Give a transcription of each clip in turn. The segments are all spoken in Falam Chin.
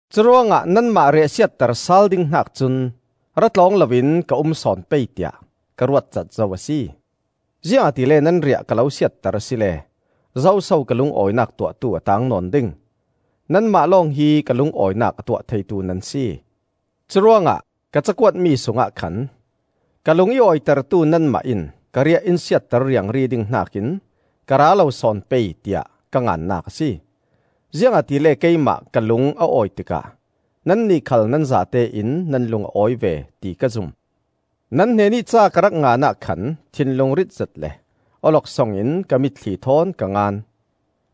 Curuangah nanmah riahsiatter sal ding hnak cun ra tlawng loin ka um sawn pei tiah ka ruatcat zo a si. Ziangahtile nan riah ka lo siatter asile zo so ka lungawinak tuahtu a taang nawn ding? Nanmah lawng hi ka lungawinak a tuah theitu nan si. Curuangah ka cakuatmi sungah khan ka lung i awitertu nanmah in ka riah in siatter riangri ding hnakin ka ra lo sawn pei, tiah ka ngannak a si. Ziangahtile keimah ka lung a awi tikah nannih khal nan zatein nan lung a awi ve, ti ka zum. Nan hnenih ca ka rak ngan ah khan thinlung ritzet le awloksong in ka mitthli thawn ka ngan.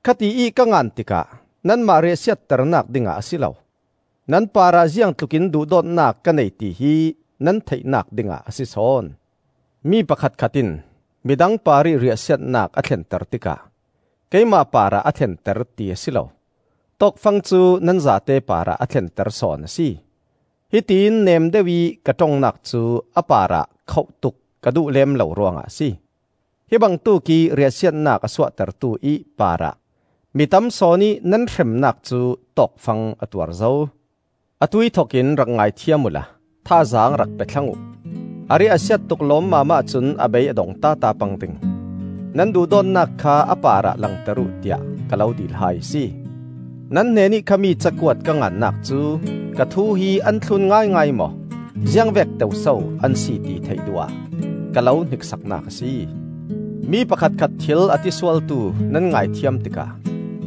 Khatiih ka ngan tikah nanmah riahsiat ternak dingah a si lo; nan parah ziangtlukin duhdawtnak ka nei tihi nan theihnak dingah a si sawn. Mi pakhatkhat in midang parih riahsiatnak a thlenter tikah keimah parah a thlenter ti a si lo, tawkfang cu nan zate parah a thlenter sawn a si. (Hitiin neemdeuh ih ka ṭongnak cu a parah khoh tuk ka duh lem lo ruangah a si.) Hi bangtuk ih riahsiatnak a suahtertu ih parah mi tam sawnih nan hremnak cu tawkfang a tuar zo. Atuih thokin rak ngaithiam uhla thazaang rak pe thlang uh; a riah a siat tuk lawmmam ahcun a bei a dong tata pang ding. Nan duhdawtnak kha a parah langter uh tiah ka lo dil hai a si. Nan hnenih khami cakuat ka ngannak cu ka thu hi an thlun ngaingai maw, ziangvek teu so an si ti theih duh ah ka lo hniksaknak a si. Mi pakhatkhat thil a ti sualtu nan ngaithiam tikah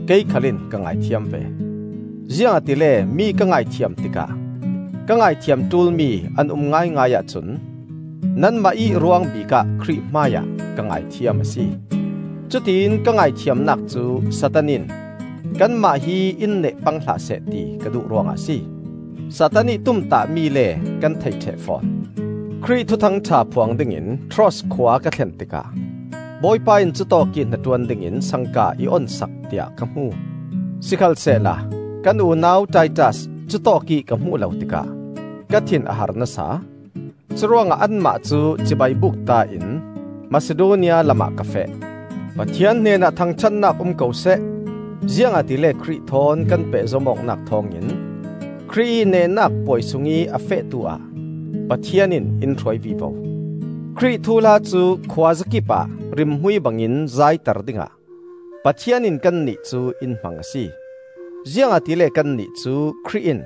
kei khal in ka ngaithiam ve. Ziangahtile mi ka ngaithiam tikah (ka ngaithiam ṭulmi an um ngaingai ahcun) nanmah ih ruang bikah Khrih hmaiah ka ngaithiam a si. Cutiin ka ngaithiamnak cu Satan in kanmah hi in neh pang hlah seh ti ka duh ruangah a si. Satan ih tumtahmi le kan thei ṭheh fawn. Khrih Thuthang ṭha phuang dingin Troas khua ka thlen tikah Bawipa in cutawkih hnaṭuan dingin sangka i on sak tiah ka hmu. Sikhalsehla kan unau Titas cutawkih ka hmuh lo tikah ka thin a har nasa. Curuangah anmah cu cibai bukta in Masidonia lamah ka feh. Pathian hnenah thangṭhatnak um ko seh! Ziangahtile Khrih thawn kan pehzom awknak thawngin Khrih ih nehnak puai sungih a fehtu ah Pathian in in hruai vivo. Khrih thuhla cu khuazakip ah rimhmui bangin zaiter dingah Pathian in kannih cu in hmang a si. Ziangahtile kannih cu Khrih in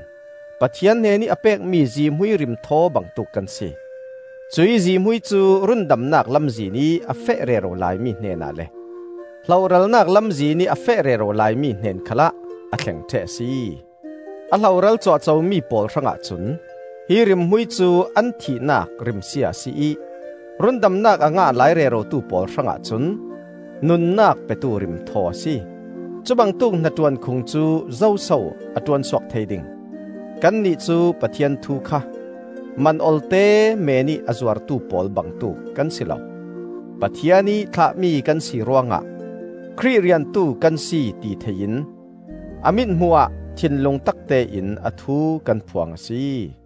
Pathian hnenih a pekmi zihmui rimthaw bangtuk kan si. Cuih zihmui cu rundamnak lamzinih a feh rero laimi hnenah le hlohralnak lamzinih a feh rero laimi hnen khalah a thleng ṭheh a si. A hloral cuahcomi pawl hrangah cun hi rimhmui cu an thihnak rimsia a si ih, rundamnak a ngah lai rerotu pawl hrangah cun nunnak petu rimthaw a si. Cubangtuk hnaṭuan khung cu zoso a ṭuansuak thei ding? Kannih cu Pathian thu kha man olte meenih a zuartu pawl bangtuk kan si lo. Pathian ih thlahmi kan si ruangah Khrih riantu kan si ti thei in a mithmuh ah thinlung taktein a thu kan phuang a si.